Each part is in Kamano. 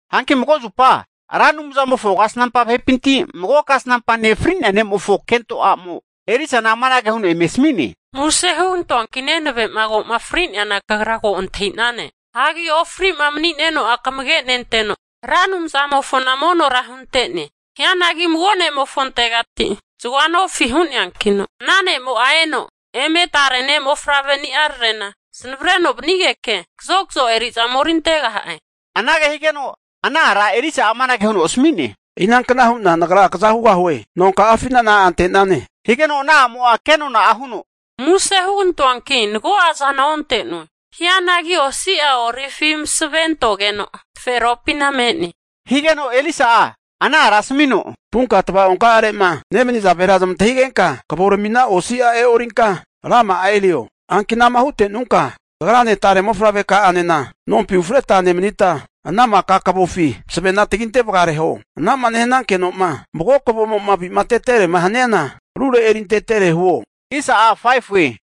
Hanki mago zupa Ra Anumzamofo kasnampa vahepinti mago kasnampa ne' fri'nea ne'mofo kento a'mo Elisana amanage huno eme asmi'ne, Muse hugantoanki nenave'ma ko'ma fri'neana kagra ko antahi'nane. Hagi ofri'ma mani'neno'a kamage nenteno, Ra Anumzamofona monora hunte'ne. Hianagi mago ne'mofontegati zagoa nofi hu'neankino, ana ne'mo'a eno eme tare ne'mofavre ni'ararena zanavreno vanigeke kazokazo eri'za omerintegaha'e. Anage higeno ana ara Elisa'a amanage huno asmi'ne, Inankna hu'na nagra kaza hugahue? Nonka'afina na'a ante'nane, higeno ana a'mo'a ke nona'a huno, Muse hugantoanki mago'a zana onte'noe. Hianagi osi'a olivi masave antogeno taferopina me'ne. Higeno Elisa'a ana ara asmino, Vunka tvaonka'arema nemaniza vahera zamantahigenka kavoramina osi'a e'orinka rama'a erio. Hanki anama hute'nunka, kagrane tare mofavre ka'anena nompi ufreta kafana erigita nemanita, ana maka kavofi masavena taginte vagareho. Anama nehanankenoma mago kavomo'ma aviteterema haniana, rure erintetere huo.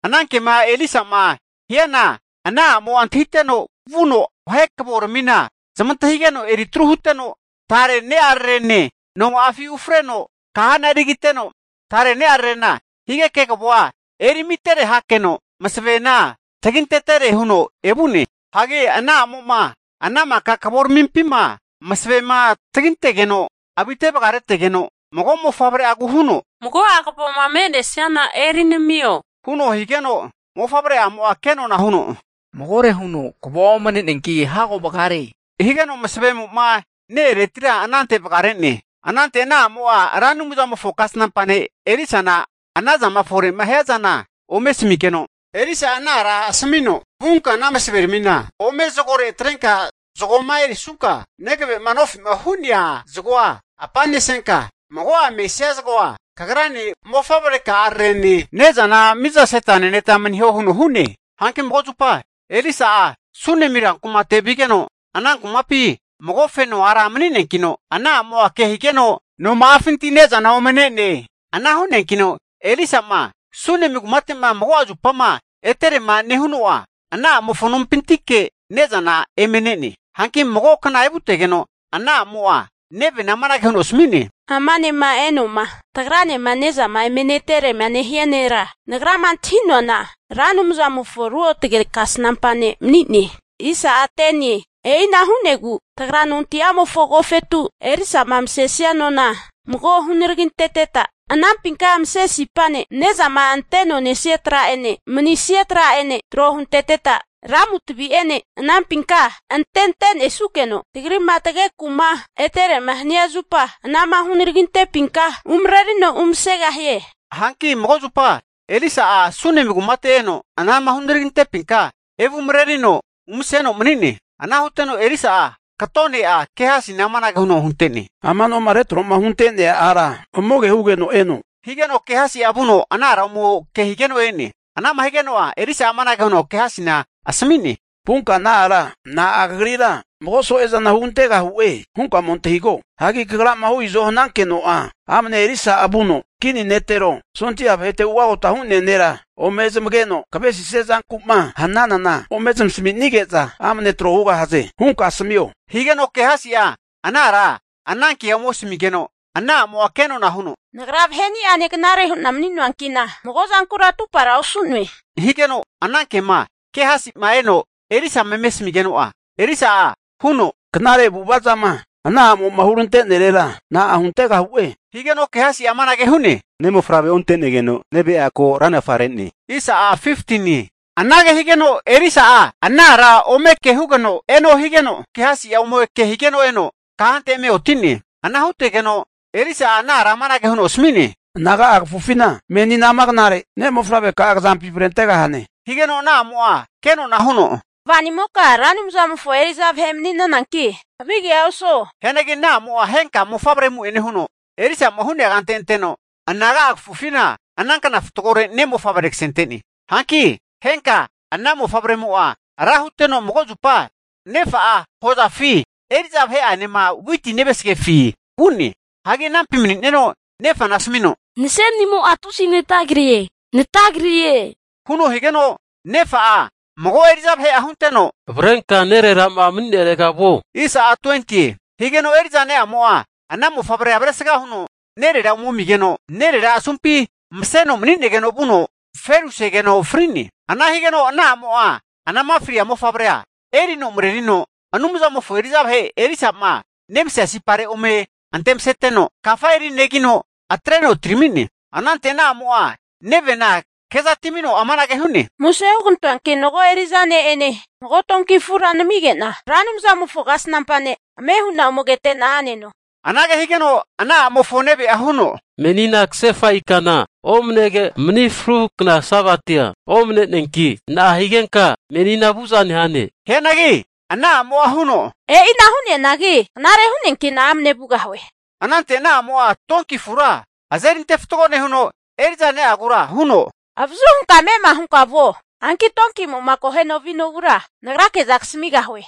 Ana kema Elisa'ma hiana ana a'mo'a antahiteno, vuno vahe kavoramina zamantahigeno eritru huteno, tare ne'ararene noma'afi ufreno kahana erigiteno, tare ne'ararena ke higeke kavoa eri amitere hakeno masavena tagintetere huno evu'ne. Hanki ana a'mo'ma ana maka kavoramimpima masavema tagintegeno avite vagaretegeno, mago mofavre'agu huno, Mago'a kavoma me'nesiana eri namio, huno higeno mofavre'amo'a kenona'a huno, Magore huno kavoa omne'neanki hago vagare. Higeno masavemo'ma ne-eretira anante vagare'ne. Anante ana a'mo'a Ra Anumzamofo kasnampa ne' Elisana anazama fore'ma hiazana ome asamigeno, Elisa'a ana ara asmino, Vunka ana masaveramina ome zagore atrenka zagoma erisunka, negave'ma nofi'ma hu'neana zagoa apanesenka, mago'a mesia zagoa kagrane mofavre ka'ararene ne'zana mizaseta neneta maniho huno hu'ne. Hanki mago zupa Elisa'a Sunemi rankumate vigeno, ana kumapina mago feno ara mani'neankino, ana a'mo'a kehigeno noma'afinti ne'zana ome ne'ne. Ana hu'neankino Elisa'ma Sunemi kumate'ma mago'a zupama eterema nehuno'a, ana a'mofo nompintike ne'zana eme ne'ne. Hanki mago'a kna evutegeno, ana a'mo'a nevena amanage huno asmi'ne, Ama ne'ma eno'ma tagranema ne'zama eme neterema nehia nera, nagrama antahi'noana Ra Anumzamofo ruotge kasnampa ne' mani'ne. E'ina hu'negu tagra nonti'amofo agofetu Elisa'ma masesia nona mago hunaraginteteta, anampinka mase sipane, ne'zama anteno nesia tra'ene, manisia tra'ene tro hunteteta, lamu tavi'ene anampinka antente'nesukeno, tagri'ma tageku'ma eterema hania zupa, anama hunaragintepinka umrerino umasegahie. Hanki mago zupa Elisa'a Sunemi kumate eno, anama hunaragintepinka evumarerino umaseno mani'ne. Ana huteno Elisa'a kato ne'a Gehasina amanage huno hunte'ne, Ama noma retro'ma hunte'nea ara ome kehugeno eno, higeno Gehasi'a vuno ana ara ome kehigeno e'ne. Anama higeno'a Elisa'a amanage huno Gehasina asmi'ne, Vunka ana ara na'a kagrira mago so'ezana hugantegahu'e hunka ome antahigo. Hagi kagrama hu izo hanankeno'a, amne Elisa'a vuno kini netero, sondia vahete ugota hu'nea nera ome zamageno kavesisia zanku'ma hnanana, ome zamasaminege'za amne trohugahaze hunka asmio. Higeno Gehasi'a ana ara anankea ome asmigeno, ana amo'a kenona huno, Nagra vahe'ni'ane knare hu'na mani'noanki'na mago'zankura atupara osu'noe. Higeno ana ke'ma Gehasi'ma eno Elisama eme asmigeno'a Elisa'a huno, Knare avu'avazama ana a'mo'ma hurante'nerera na'a huntegahu'e? Higeno Gehasi'a amanage hu'ne, Ne' mofavrea onte'negeno neve'a ko ranafa re'ne. Anage higeno Elisa'a ana ara ome kehugeno eno higeno, Gehasi'a ome kehigeno eno kahante eme oti'ne. Ana hutegeno Elisa'a ana ara amanage huno asmi'ne, Anaga'a kafufina meni amana knare, ne' mofavreka'a kazampi avaregahane. Higeno ana a'mo'a ke nona huno, kvanimoka Ra Anumzamofo eri'za vahe mani'nanki havigea osuo. Hianagi ana a'mo'a henka mofavre amu'ene huno, Elisa'ma hu'nea kante anteno anaga'a kafufina, ana kna fatgore ne' mofavre kasente'ne. Hanki henka ana mofavremo'a ra huteno mago zupa, nefa'a hozafi eri'za vahe'anema witi nevasgazafi vu'ne. Hanki anampi mani'neno nefana asmino, Nase'nimo'a tusi natagrie, natagrie, huno higeno, nefa'a mago eri'za vahe hunteno, avrenka nerera'ma mani'nerega vuo. Higeno eri'za ne'mo'a ana mofavrea avresga huno nerera ome ami'geno, nerera asumpi maseno mani'negeno vuno ferusegeno fri'ne. Ana higeno ana a'mo'a anama fria mofavre'a erino marerino, Anumzamofo eri'za vahe Elisa'ma nemasea sipare ome antemaseteno, kafa erinegino atreno atirami'ne. Anante ana a'mo'a nevena kezatimino anage hu'ne, Muse hugantoanki mago eri'za ne'ene mago donki afura namige'na Ra Anumzamofo kasnampa ne' ame hu'na ome kete'na a'neno. Anage higeno ana a'mofo neve'a huno, Menina kasefa ikana omnege, mani fruhu kna Sabatia omne'neanki, na'a higenka menina vu'za nehane? Hianagi ana a'mo'a huno, E'ina hu'neanagi knare hu'neanki'na amne vugahue. Anante ana a'mo'a donki afura azerinte fatgo nehuno, eri'za ne'agura huno, avazu hunka ame'ma hunka vuo. Hanki donkimo'ma akoheno vinogura nagrake'za kasamigahue.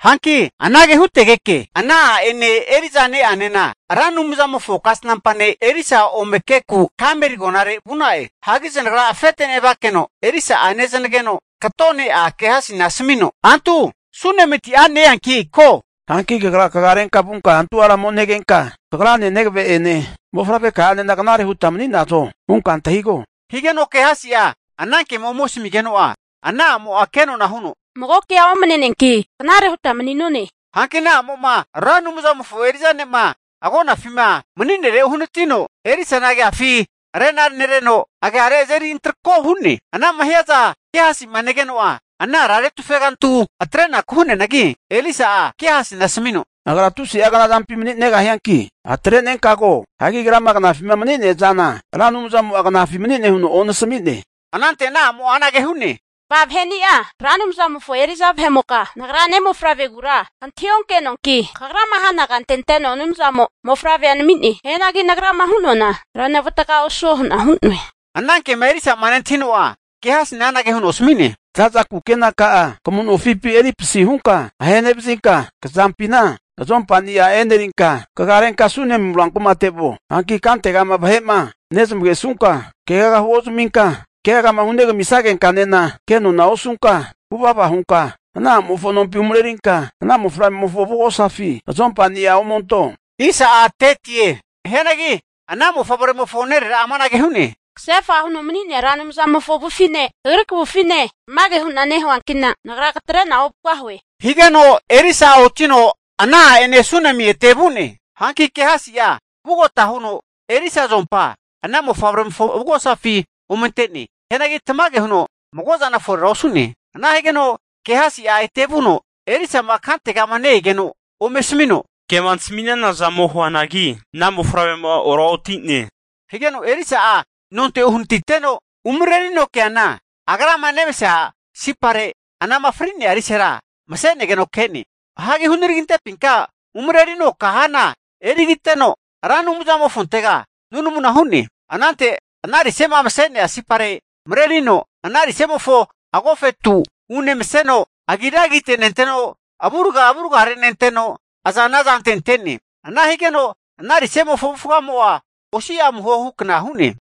Hanki anage hutegeke, ana a'ene eri'za ne'anena, Ra Anumzamofo kasnampa ne' Elisa ome keku Karmeli agonare vu'na'e. Hanki zanagra afete nevakeno Elisa'a nezanageno kato ne'a Gehasina asamino, antu Sunemiti a' ne-eanki ko. Hanki kagra kagarenka vunka ana a'ra ome negenka, kagrane, negave'ene, mofavreka'anena knare huta mani'nazo? hunka antahigo. Higeno Gehasi'a anankema ome asmigeno'a, ana a'mo'a kenona'a huno, mago kea omne'neanki knare huta mani'none. Hanki ana a'mo'ma Ra Anumzamofo eri'za ne'ma agonafima mani'nere uhanatino, Elisana agiafi rena nereno, agiare azeri antroko hu'ne, anama hiaza Gehasi'ma negeno'a, ana ara retufe ogantu atreku hu'neanagi, Elisa'a Gehasina asmino, Agra tusi'a knazampi mani'negahianki atrenenka ko. Hagi agrama knafima mani'neazana Ra Anumzamo'a knafi mani'ne huno onasami'ne. Anante ana a'mo'a anage hu'ne, Kva vahe'ni'a Ra Anumzamofo eri'za vahe'moka, nagra ne'mofavregura kantahi onkenoanki, kagrama hana kante anteno Anumzamo mofavrea nami'ne. Hianagi nagrama hu'noana renavataga osuo hu'na hu'noe. Ana ke'ma Elisa'ma nentahino'a, Gehasina anage huno asmi'ne, Zaza kenaka'a kamu nofipi eri pasihunka ahenevazinka kazampina azompani'a enerinka kagarenka Sunemi rankumate vuo. Hanki kantegama vahe'ma nezmagesunka keaga huozaminka, keagama hunegami sagenkanena kenona osunka, vuvava hunka ana a'mofo nompi umarerinka ana mofavremofo avugosafi azompania omento. Hianagi ana mofavremofo nerera'a amanage hu'ne, Kasefa huno mani'nea Ra Anumzamofo avufine kagri kavufine tamage hu'na nehuankina, nagra katre'na ovugahue, higeno Elisa'a otino ana a'ene Sunemi ete vu'ne. Hanki Gehasia vugota huno Elisa azompa ana mofavremofo avugosafi ome ante'ne. Hianagi tamage huno mago'zana forera osu'ne. Ana higeno Gehasia ete vuno Elisa'ma kantegama ne-egeno ome asmino, Kema nasmi'nazana ome huanagi ana mofavremo'a oraoti'ne. Higeno Elisa'a nonte uhanatiteno umarerino keana, agrama nemasea sipare, anama fri'nea risera mase'negeno ke'ne. Hagi hunaragintepinka umarerino kahana erigiteno, Ra Anumzamofontega nunamuna hu'ne. Anante ana rise'ma mase'nea sipare marerino ana rise'mofo agofetu unemaseno, agira agite nenteno, avurga avure nenteno, azana azante ante'ne. Ana higeno ana rise'mofo avufgamo'a osi'a amuho hukna hu'ne.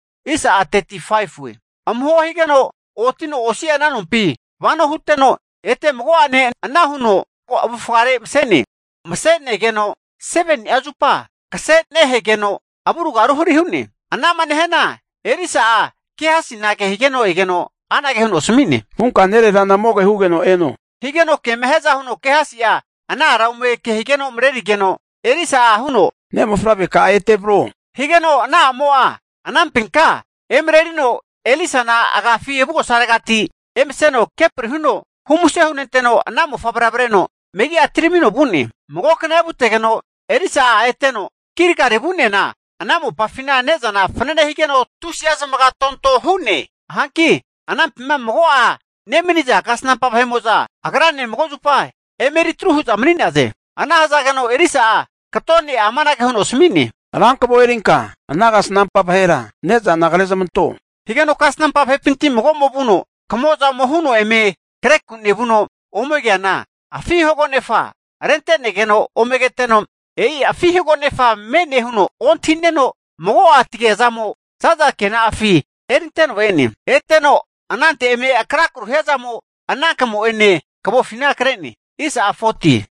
Amuho higeno otino osi'a ana nompi vano huteno ete mago'ene ana huno avufgare mase'ne. Mase'negeno seveni'a zupa kasera ruteno avurga ruhari hu'ne. Ana'ma nehiana Elisa'a Gehasina kehigeno egeno anage huno asmi'ne, vunka nererana ome kehugeno eno, higeno kema hiaza huno Gehasi'a ana ara ome kehigeno emarerigeno, Elisa'a huno, ne'mofavreka'a ete avro. Higeno ana a'mo'a anampinka emarerino Elisana agafi avugosaregati emeseno kepri huno humuse hunenteno, ana mofavre'a avreno megi'a atiramino vu'ne. Mago'a kna evutegeno Elisa'a eteno Gilgali vu'neana ana mopafina ne'zana fanane higeno tusi'a zamaga tonto hu'ne. Hanki anampima mago'a nemaniza kasnampa vahe'mo'za agrane mago zupa eme eritru hu'za mani'naze. Ana hazageno Elisa'a kato ne'a amanage huno asmi'ne, Rankavo erinka ana kasnampa vahera ne'zana krezamanto. Higeno kasnampa vahepinti mago'mo vuno kamo'za ome huno eme kreku nevuno ome keana, afi hagonefa rente'negeno ome keteno, e'i afi hagonefa me'ne huno ontahineno, mago'a tagiazamo zaza kena'afi erinteno e'ne. Eteno anante eme akrakru hiazamo ana kamo'ene kavofina kre'ne.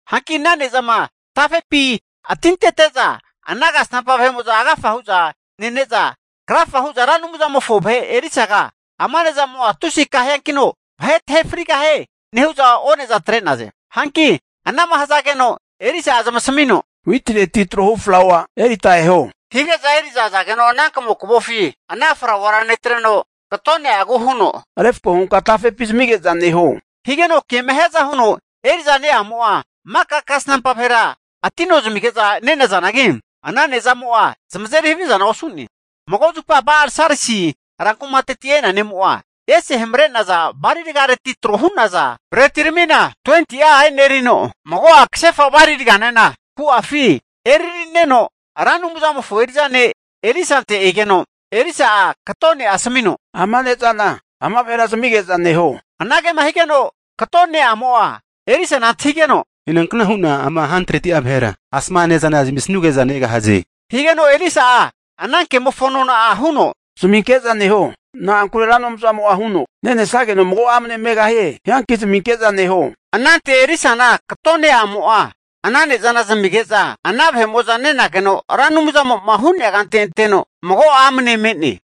Hanki ana ne'zama tafepi atintete'za, ana kasnampa vahe'mo'za agafa hu'za nene'za krafa hu'za, Ra Anumzamofo vahe Elisaga ama ne'zamo'a tusi akaheankino vahe tahe frigahie nehu'za one'za atre'naze. Hanki anama hazageno Elisa'a zamasamino, witireti trohu flaua erita eho, hige'za eri'za azageno ana kamo'ma kre'naza kavofi ana flauara netreno kato ne'agu huno, refko hunka tafepi zamige'za neho. Higeno kema hiaza huno eri'za ne'amo'a maka kasnampa vahera atino zamige'za ne'nazanagi, ana ne'zamo'a zamazeri havizana osu'ne. Mago zupa Ba'al-Salisa rankumateti e'nea ne'mo'a, ese hamre'naza bali ragareti tro hu'naza bretiramina 20'a enerino, mago'a kasefa bali raganena ku'afi erarineno Ra Anumzamofo eri'za ne' Elisante egeno, Elisa'a kato ne'a asmino, Ama ne'zana ama vahera zamige'za neho. Anage higeno kato ne'amo'a Elisana antahigeno, Inankna hu'na ama 100'a vahera, asama ne'zana zamisuge'za negahaze. Higeno Elisa'a ana kemofo nona huno, Zaminke'za neho. Na'ankure Ra Anumzamo'a huno, nenesageno mago'a amne megahie hianki zaminke'za neho. Anante Elisana kato ne'amo'a ana ne'zana zamige'za nenageno, Ra Anumzamo'ma hu'nea kante anteno mago'a amne me'ne.